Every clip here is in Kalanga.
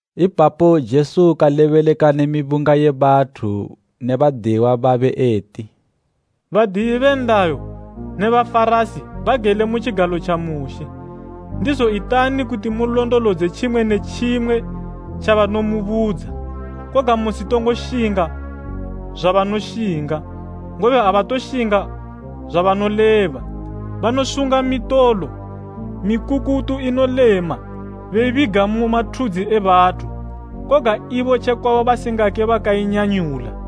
Ipapo Jesu kalebeleka ne mibunga ye bathu ne badiyiwa babe eti, Badiyi be nlayo ne Bafarasi bagele mu tjigalo tja Mushe. Ndizo itani kuti mulondolodze tjimwe ne tjimwe tjabanomubudza. Koga musitongo shinga zwabanoshinga, ngobe abatoshinga zwabanoleba. Banosunga mitolo mikukutu inolema beibiga mu mathudzi e bathu, koga ibo tjekwabo basingake bakainyanyula.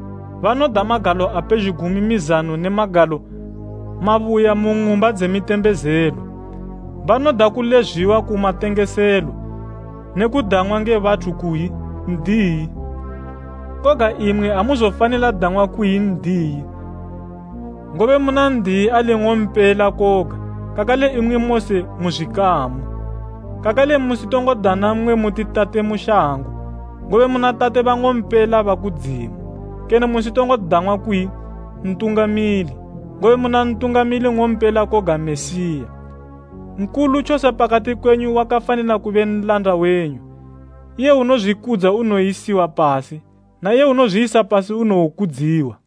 Banoda magalo a pezhugwi mu mizano ne magalo mabuya mu ng'umba dze mitembezelo. Banoda kulezwiwa ku matengeselo ne kudang'wa nge bathu kuyi, ‘N'diyi.’ Koga imwi amuzofanila dang'wa kuyi ‘N'diyi,’ ngobe muna N'diyi ali ung'ompela koga kakale imwi mose mu zwikamu. Kakale musitongo dana mmwe muti tate mu shango, ngobe muna tate bang'ompela ba kudzimu. Kene musitongo dang'wa kuyi ‘Ntungamili,’ ngobe muna ntungamili ng'ompela koga Mesiya Nkulu tjose pakati kwenyu wakafanila kube nlanda wenyu. Iye unozwikudza unowoyisiwa pasi na iye unozwiyisa pasi unowokudziwa.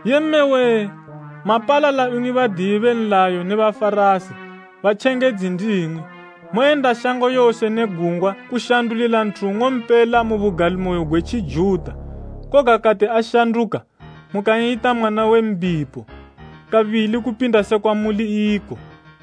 “Yee mme wee! Mapalala imwi badiyi be nlayo ne Bafarasi, batjengedzi ndimwi! Moyenda shango yose ne gungwa kushandulila nthu nng'ompela mu bugalimoyo gwe Tjijuta, koga kati ashanduka mukan'yita mwana we mbipo kabili kupinda sekwa muli iko.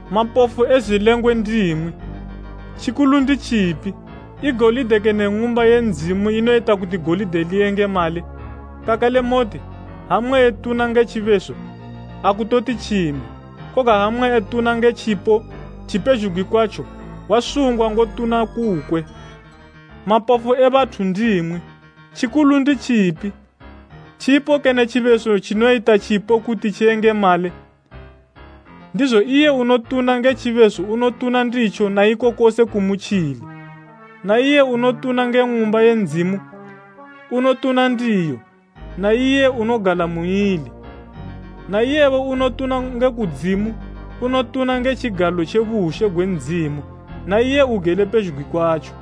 Mapofu e zwilengwe ndimwi! Tjikulu nditjipi, i golide kene Ng'umba ye Ndzimu inoyita kuti golide liyengemale? Kakale moti, ‘Ha mmwe etuna nge tjibeso, akutoti tjimwe, koga ha mmwe etuna nge tjipo tjipezhugwi kwatjo, wasungwa ngotuna kukwe.’ Mapofu e bathu ndimwi! Tjikulu nditjipi, tjipo kene tjibeso tjinoyita tjipo kuti tjiyengemale? Ndizo iye unotuna nge tjibeso unotuna nditjo na iko kose kumutjili; na iye unotuna nge Ng'umba ye Ndzimu unotuna ndiyo, na iye unogala muili. Na iyebo unotuna nge kudzimu unotuna nge tjigalo tje bushe gwe Ndzimu na iye ugele pezhugwi kwatjo.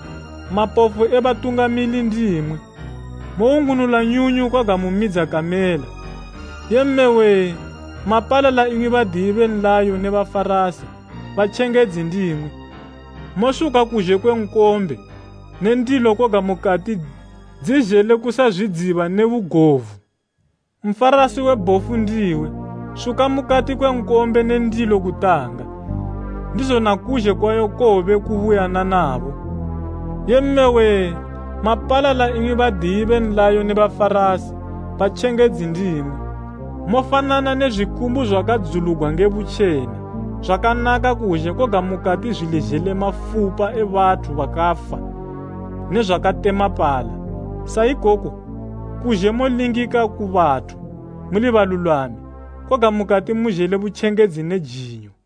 Mapofu e batungamili ndimwi! Mowungunula nyunyu koga mumidza kamela. “Yee mme wee! Mapalala imwi badiyi be nlayo ne Bafarasi, batjengedzi ndimwi! Mosuka kuzhe kwe nkombe ne ndilo koga mukati dzezhele kusazwidziba ne bugovu. Nfarasi we bhofu ndiwe! Suka mukati kwe nkombe ne ndilo kutanga, ndizo na kuzhe kwayo kowobe kubuyananabo. “Yee mme wee! Mapalala imwi badiyi be nlayo ne Bafarasi, batjengedzi ndimwi! Mofanana ne zwikumbu zwakadzulugwa nge butjena, zwakanaka kuzhe koga mukati zwili zhele mafupa e bathu bakafa ne zwakatemapala. Sa ikoko, kuzhe molingika ku bathu muli balulwami, koga mukati muzhele butjengedzi ne jinyo.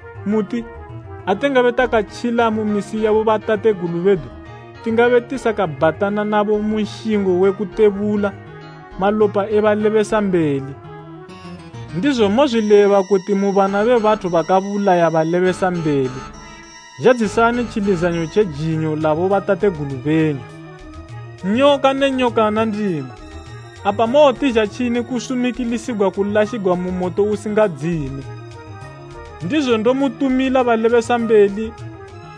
muti, ‘Ha tingabe takatjila mu misi ya bobatategulu bedu, tingabe tisakabhatana nabo mu nshingo we kutebula malopa e balebesambeli.’ Ndizo mozwileba kuti mu bana be bathu bakabulaya balebesambeli. Zhadzisani tjilizanyo tje jinyo la bobatategulu benyu. Nyoka ne nyokana ndimwi! Apa mowotizha tjini kusumikilisigwa kulashigwa mu moto usingadzime? Ndizo ndomutumila balebesambeli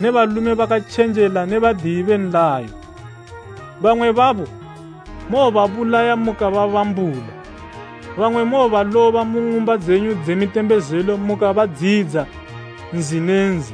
ne balume bakatjenjela ne badiyi be nlayo. Bamwe babo mowobabulaya mukababambula, bamwe mubaloba mu ng'umba dzenyu dze mitembezelo mukabadziyidza nzi ne nzi.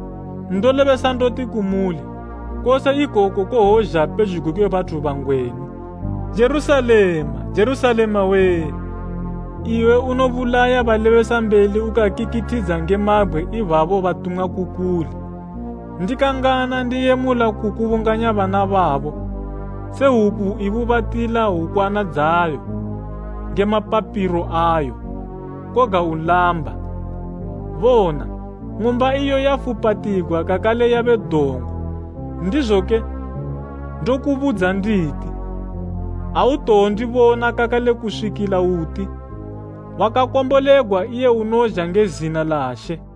Ndolebesa ndoti kumuli, kose ikoku kowozha pezhugwi kwe bathu bangwenu. “Jerusalema, Jerusalema wee! Iwe unobulaya balebesambeli ukakikithidza nge mabgwe ibabo batumwa ku kuli. Ndikangana ndiyemula kukubunganya bana babo se hwuku ibubatila hwukwana dzayo nge mapapilo ayo, koga ulamba. Bona, ng'umba iyo yafupatigwa kakale yabe dongo. Ndizoke ndokubudza nditi, autowondibona kakale kuswikila uti, ‘Wakakombolegwa iye unozha nge zina la She.’”